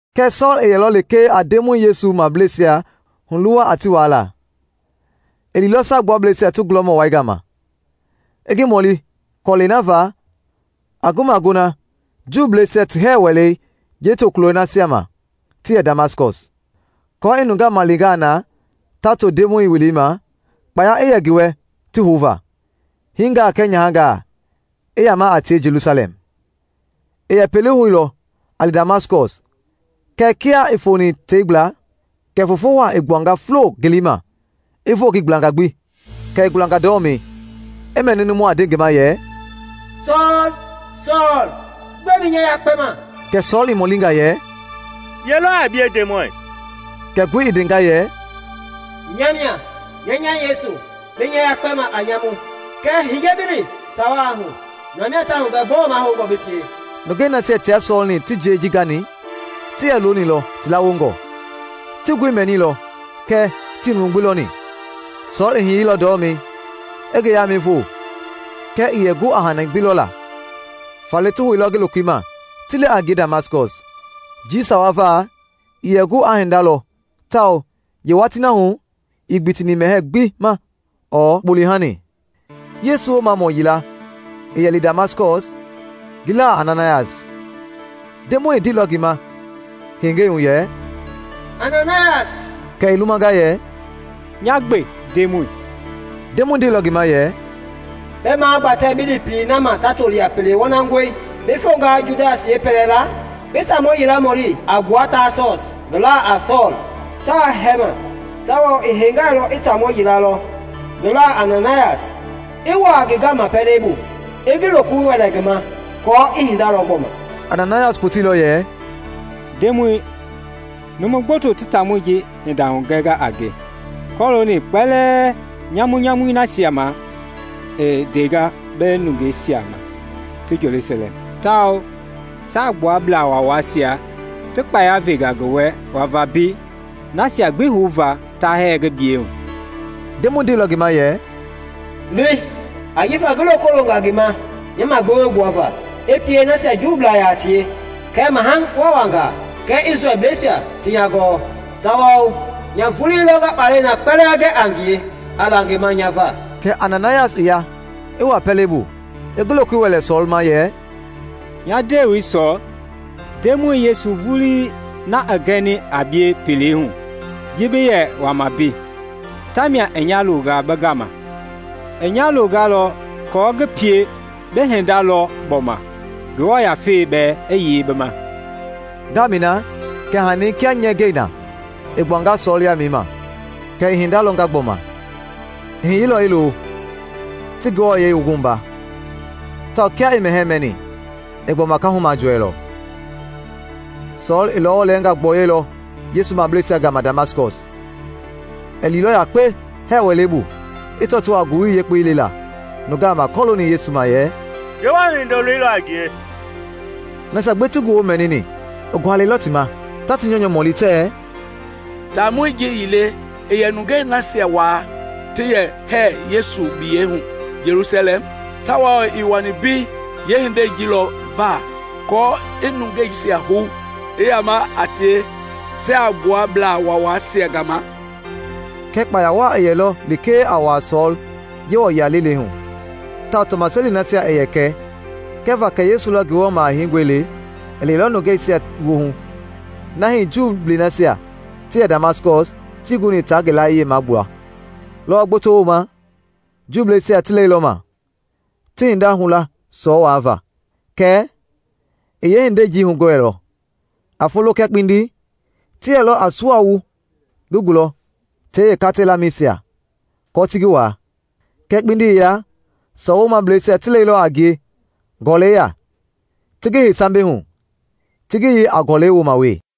Kɛɛ Sɔɔl i yɛlɔ lekee a Ndemɔi Yesu mableisia huluwa a ti waala. I liilɔ Saagbuablɛisia ti gulɔmɔ wai gama, i ngi mɔli kɔlɛi na va a ngi magona Juuisia ti hɛɛ wɛlei yeetokulɔi nasia ma ti yɛ Damaskɔs, aako i nungaa malengaa na ta to Ndemɔi welei ma, kpaya i yɛ ngi wɛ ti houva, hiingaa kɛɛ nyahangaa, i yaama a tie Jelusalɛm. I yɛ pelei hu lɔ a li Damaskɔs kɛɛ kia i foni tei gbla, kɛ foofo waa i gbuanga fulo ngelei ma i voo ngi gblanga gbi. Kɛ i gulanga ndɔlɔmei, i mɛni numu a nde ngi ma yɛ, “Sɔɔl, Sɔɔl! Gbɛe bi nya yakpɛ ma?” Kɛ Sɔɔl i mɔlinga yɛ, “Ye lɔ a bie, Ndemɔi?” Kɛ ngoi i ndenga yɛ, “Nya mia, nya nya Yesu bi nya yakpɛma a nyamu. Kɛɛ hiye bi li taa wai hu, na mia ta hugɛ gbɔɔ mahoungɔ bi pie.” Nungɛi nasia tia Sɔɔl-ni ti jiei ji gani, ti yɛ loonilɔ ti lawongɔ; ti ngoi mɛnilɔ kɛɛ tii numu gbi lɔni. Sɔɔl i hiyeilɔ ndɔlɔmei i ngi yaamɛi voo kɛɛ ii yɛ gu a hani gbi lɔla. Faale ti houilɔ ngi lokoi ma ti li a ngie Damaskɔs. Njii sawa va ii yɛ gu aa hinda lɔ tawao yeewatii na hu ii gbitini mɛhɛɛ gbi ma ɔɔ kpɔlehani. Yesu Woomamɔ yila i yɛ li Damaskɔs ngi laa a Ananayas. Ndemɔi i ndeilɔ ngi ma hengei hu yɛ, “Ananayas!” Kɛ i lumanga yɛ, “Nya gbe, Ndemɔi.” Ndemɔi ndeilɔ ngi ma yɛ, “Bi magbatɛ bi li pelei na ma ta toli a ‘Pele Wɔnangɔi;’ bi fonga Judas yeepɛlɛla, bi taamɔ yila mɔli a gbua Taasɔs ngi laa a Sɔɔl. Taa hɛɛma, tawao i hengailɔ i taamɔ yila lɔ ngi laa a Ananayas, i wuaa ngi gama pɛlei bu i ngi lokoi wɛlɛ ngi ma aako i hinda lɔ gbɔma.” Ananayas poteilɔ yɛ, “Ndemɔi, numu gboto ti taamɔi ji hinda hugɛnga a nge kɔlooni kpalɛ nyamunyamui nasia ma i ndanga bi nungei nasia ma ti Jelusalɛm. Tawao Saagbuablaa Waawaisia ti kpaya venga ngi wɛ wava mbei nasia gbi houva ta hɛɛ bi biyɛi hu.” Ndemɔi ndeilɔ ngi ma yɛ, “Li, ajifa ngi loko longa ngi ma nya magbewe gbuava, i pie nasia Juubla yaa tie kɛɛ maha waawangaa kɛɛ Isrɛlbleisia ti nya gɔɔ. Tawao nya vulii lɔ nga kpalɛi na kpɛlɛɛ gɛ a ngie a la ngi ma nya va.” Kɛ Ananayas i ya, i wuaa pɛlei bu, i ngi lokoi wɛlɛ Sɔɔl ma yɛ, “Nya ndewei Sɔɔl, Ndemɔi Yesu vulii na i gɛni a bie pelei hu ji bi yɛ wama mbei, tamia i nya longa bi gama. I nya longalɔ aako ngi pie bi hinda lɔ gbɔma, Ngewɔ Yafei bɛɛ i yei bi ma.” Ngaamɛi na kɛ hani kia nyɛɛgɛi na i gbuanga Sɔɔl yaamɛi ma, kɛ i hinda lɔnga gbɔma. I hiyeilɔ i lo, ti ngi wua, tawao kia i mɛhɛɛ mɛni, i gbɔma kaahu majɔɛilɔ. Sɔɔl i lɔwɔ lɛɛngaa gbɔyɔilɔ Yesu mableisia gama Damaskɔs. I liilɔ yakpe hɛɛ wɛleisia bu i tɔtoo a Ngowili Yekpei lela nungaa ma kɔlooni Yesu ma yɛ, “Ngewɔ Hindoloi lɔ a ngie.” Nasia gbi ti ngi woo mɛnini i gualɛilɔ ti ma, ta ti nyɔunyɔ mɔlimɔli tɛɛ, “Taamɔi ji ii le i yɛ nungei nasia waa ti yɛ hɛɛ Yesu biyɛi hu Jelusalɛm? Tawao ii wani mbei yeehindei ji lɔ va aako i yeenungeisia hou i yaama a tie Saagbuablaa Waawaisia gama?” Kɛɛ kpaya waa i yɛlɔ lekee a wuaa Sɔɔl Yewɔ yia lelei hu tawao tɔmaseli nasia i yɛ kɛ kɛva kɛ Yesu lɔ Ngewɔ Maha Heingɔi le i lɛilɔ nungeisia woohu na hii Juu nasia ti yɛ Damaskɔs tii guni a ngi layie magbuala. Lɔwɔ gboto wooma, Juuisia ti lɛilɔma, ti hinda hula Sɔɔl waava; kɛɛ i yeehindei ji hugɔɛilɔ. A folo kɛɛ kpindi ti yɛlɔ a sua wu ngi gulɔ tei yeekata lamɛisia aako ti ngi waa. Kɛɛ kpindi yila Sɔɔl woomableisia ti lɛilɔ a ngie gɔlɛi ya, ti ngi hei sambɛi hu, ti ngi yei a gɔlɛi wooma wee.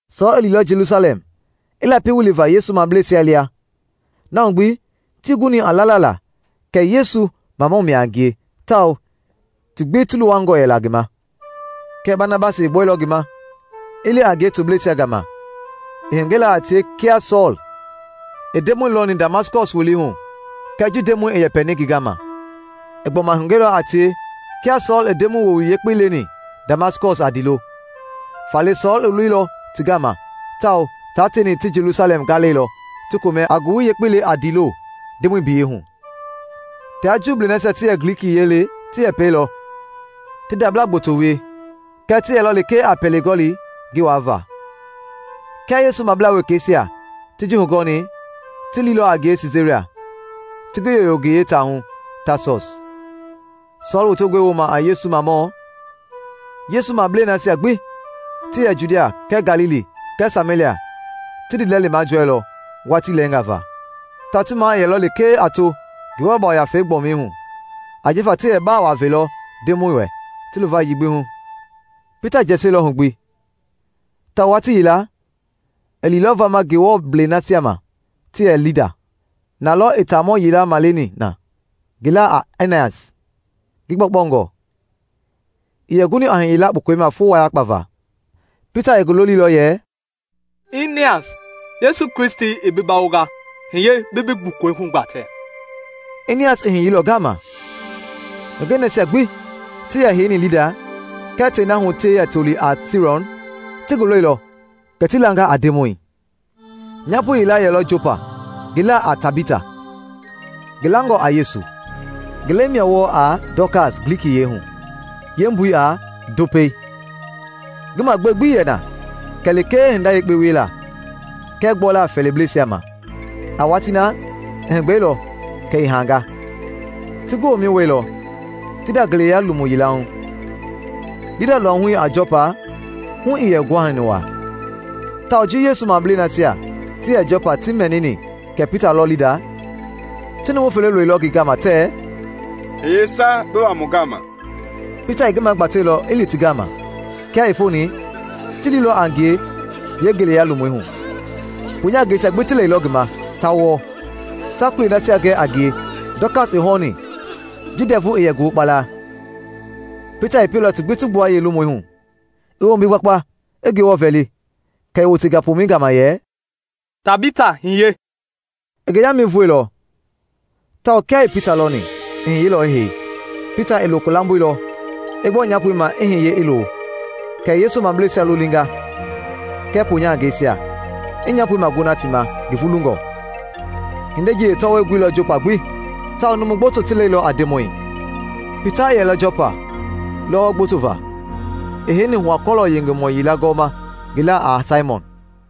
Sɔɔl i liilɔ Jelusalɛm i lapi wiliva Yesu mableisia lia. Na hu gbi tii guni a lala la kɛ Yesu mamɔ mia a ngie tawao ti gbi ti luwangɔ yɛla ngi ma. Kɛɛ Banabasi i gbɔilɔ ngi ma, i li a ngie tobleisia gama. I hugɛilɔ a tie kia Sɔɔl i Ndemɔi lɔni Damaskɔs welei hu kɛɛ ji Ndemɔi i yɛpɛni ngi gama. I gbɔma hugɛilɔ a tie kia Sɔɔl i Ndemɔi Woowili Yekpei leni Damaskɔs a ndiilo. Faale Sɔɔl i loilɔ ti gama tawao taa teeni ti Jelusalɛm gaalɛilɔ ti komɛ a Ngowili Yekpei le a ndiilo Ndemɔi biyɛi hu. Tia Juui nasia ti yɛ Glikiyiɛi le ti yɛpɛilɔ, ti ndabla gboto wie, kɛɛ ti yɛlɔ lekee a pele gɔli ngi waava. Kia Yesu mablaa wekeisia ti ji hugɔɔni, ti liilɔ a ngie Siisaria, ti ngi yoyo ngi yeetaahu Taasɔs. Sɔɔl wotengɔi wooma a Yesu mamɔ, Yesu mablei nasia gbi ti yɛ Judia kɛɛ Galili kɛɛ Samelia ti ndiilɛli majɔɛilɔ watii lɛɛngaa va, tawao ti maa i yɛlɔ lekee a to Ngewɔ Yafei gbɔmi hu ajifa ti yɛ baa waa velɔ Ndemɔi wɛ ti luvayii gbi hu. Pita jɛsiɛlɔ hu gbi, tawao watii yila i liilɔ vama Ngewɔblei nasia ma ti yɛ Lida. Na lɔ i taamɔ yila maleni na ngi laa a Inias, ngi gbɔkpɔngɔ, ii yɛ guni a hiyela kpukɔi ma foo wayakpa va. Pita i ngi loliilɔ yɛ, “Inias, Yesu Kristi i bi bawonga, hiye bi bi gbukɔi hugbatɛ.” Inias i hiyeilɔ ngaama. Nungɛi nasia gbi ti yɛ heini Lida kɛɛ tei na hu ti yɛ toli a Serɔn ti ngi lɔilɔ kɛ ti langa a Ndemɔi. Nyaapo yila yɛlɔ Jɔpa ngi laa a Tabita, ngi langɔ a Yesu. (ngi lɛi mia wɔɔ a Dɔkas Glikiyiɛi hu, yeembui a “Ndopɛi.”) Ngi magbewe gbi ii yɛ na kɛ lekee hinda yekpe wiela kɛɛ gbɔla fɛɛliblɛisia ma. A watii na, i heegbɛilɔ, kɛ i hanga. Ti ngi womɛi wuɛilɔ, ti nda ngeleya lomu yila hu. Lida luahui a Jɔpa hu ii yɛ guhani waa, tawao ji Yesu mableisia nasia ti yɛ Jɔpa ti mɛnini kɛ Pita lɔ Lida, ti numu fele loilɔ ngi gama tɛɛ, “Hiye sa bi wa mu gama.” Pita i ngi magbateilɔ i li ti gama. Kia i foni, ti liilɔ a ngie yeengeleya lomui hu. Poonyahangɛisia gbi ti lɛilɔ ngi ma, ta wɔɔ, ta kulei nasia gɛ a ngie Dɔkas i hɔɔni ji ndɛvu i yɛ ngi hokpala. Pita i pieilɔ ti gbi ti gbua yeelomui hu, i wombi gbakpa, i Ngewɔ vɛli; kɛ i wotenga pomɛi gama yɛ, “Tabita, hiye!” I ngi yaamɛi voeilɔ tawao kia i Pita lɔni, i hiyeilɔ i hei. Pita i loko lamboilɔ, i gbɔ nyaapoi ma i hiye i lo. Kɛ i Yesu mableisia lolinga kɛɛ poonyahangɛisia i nyaapoi magona ti ma ngi vulungɔ. Hindei ji yeetɔwɔi guilɔ Jɔpa gbi, tawao numu gboto ti lɛilɔ a Ndemɔi. Pita i yɛlɔ Jɔpa lɔwɔ gboto va, i heini hua-kɔlɔ yengemɔ yila gɔɔma ngi laa a Saimɔn.